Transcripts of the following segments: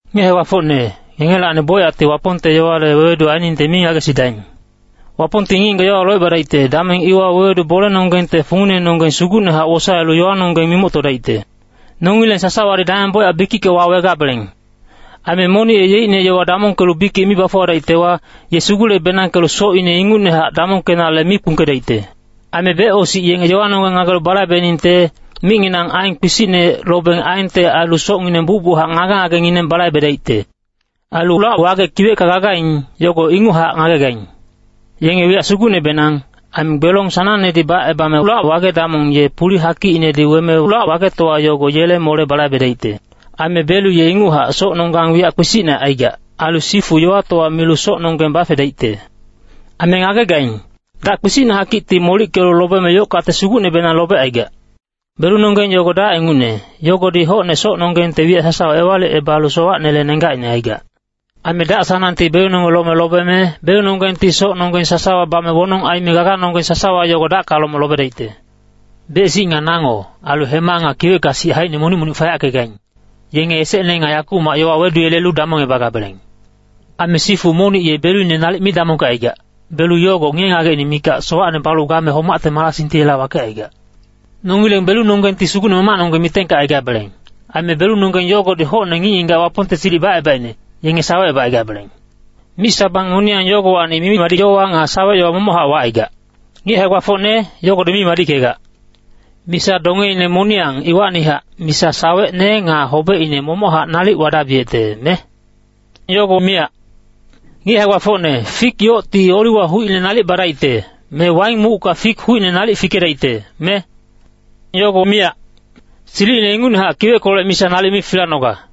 Ngic hae-gbafocne, ngengelacni bocyacti Wapongte yowale wewedu ainingte mi ngagesidaing. Wapongti ngic-ngigac yowawa locebadaicte, dameng iwa wewedu bolenonggengte funginenonggeng sugucnehac wosaelu yowanonggeng mimoctodaicte. Nongileng sasawadi dameng bocyac bikicka wawegabeleng. Aime monic ye yeicne yowa damongkelu bikic mi bafuwadaictewa, ye sugule-benangkelu socine ingucnehac damongkenale mi kpungkedaicte. Aime becosic yenge yowanonggeng ngagelu balaibeningte, micnginang aen kpisicne lobeng aente ailu socngineng bucbuchac ngage-ngagengineng balaibedaicte. Ailu lac-wage kiwecka gagaing, yogo inguchac ngagegaing. Yenge wiyac sugucnebenang, aime gbelong sanangnedi bacebame lac-wage damong ye puli hakicinedi weme lac-wagetowa yogo yele mole balaibedaicte. Aime belu ye inguchac socnonggang wiyac kpisicne aigac. Ailu sifu yowatowa milu socnonggeng bafedaicte. Aime ngagegaing, dac kpisicne hakicti molickelu lobeme yoc-kate sugucnebenang lobecaigac. Belunonggeng yogo dac ingucne, yogodi hocne socnonggengte wiyac sasawa ewalicebalu sowacnele nenggacine aicaigac. Aime dac-sanangti belunonggeng lome lobeme, belunonggengti socnonggeng sasawa bame wonong aime gaganonggeng sasawa yogo dacka lome lobedaicte. Bec-sic nga nango, ailu hema nga kiwecka sic haicine monic-monic fayackegaing, yenge esecne nga yakumac yowa weduyelelu damongebagabeleng. Aime sifu monic ye beluine nalic mi damongkecaigac, belu yogo ngiye-ngagecine mikac sowacne balu game homacte marasingti yela wakecaigac. Nongileng belunonggengti Sugucne Mamacnonggeng mitengkecaigabeleng, aime belunonggeng yogodi hocne ngic-ngigac Wapongte silic bacebaicne, yenge sawecebacaigabeleng. Mic-sabang moniyang yogowacni mimi-madic yowa nga sawec-yowa momochac wacaigac. Ngic hae-gbafocne, yogodi mi madickegac. Misa dongeine moniyang iwacnihac, misa sawecne nga hobecine momochac nalic wadabiyecte, me? Yogo miyac. Ngic hae-gbafocne, fik yocti oliwa hucine nalic badaicte, me waing mucka fik hucine nalic fikedaicte, me? Yogo miyac. Silicine ingucnehac kiweckolec misa nalic mi filanoga.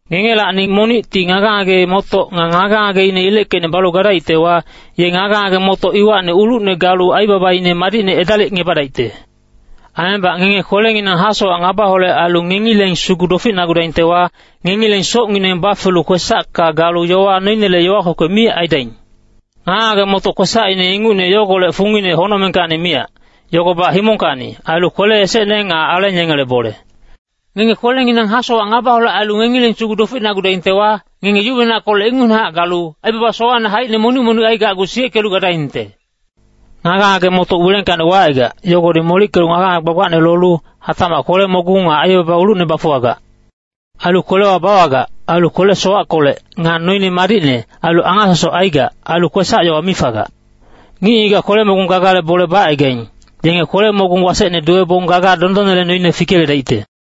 Ngengelacni monicti ngage-ngage-motoc nga ngage-ngageine ileckeicne balu gadaictewa, ye ngage-ngage-motoc iwacni ulucne galu aibabaine madicne edalicngebadaicte. Aimebac ngenge kwelenginang hasowac ngabaholec ailu ngengileng sugu doficnagudaingtewa, ngengileng socngineng bafelu kwesacka galu yowa noinele yowa kwekwe mi aidaing. Ngage-ngage-motoc kwesacine ingucne yogolec fungine honocmengkacni miyac, yogobac himongkacni, ailu kwele esecne nga aleng yengele bole. Ngenge kwelenginang hasowac ngabaholec ailu ngengileng sugu doficnagudaingtewa, ngenge yuwenackolec ingucnehac galu, aibaba sowacne haicine monic-monic aigacgu siyeckelu gadaingte. Ngage-ngage-motoc wilengkacni wacaigac, yogodi molickelu ngage-ngage gbagbacne lolu, hatacmac kwele-mogung nga aibaba ulucne bafuwagac. Ailu kwelewa bawagac, ailu kwele-sowackolec, nga noine madicne, ailu angasosoc aigac, ailu kwesac-yowa mi fagac. Ngic-ngigac kwele-mogung gagale bole bacaigaing, yenge kwele-mogung wasecne duwebong gaga dondonnele noine fikeyeledaicte.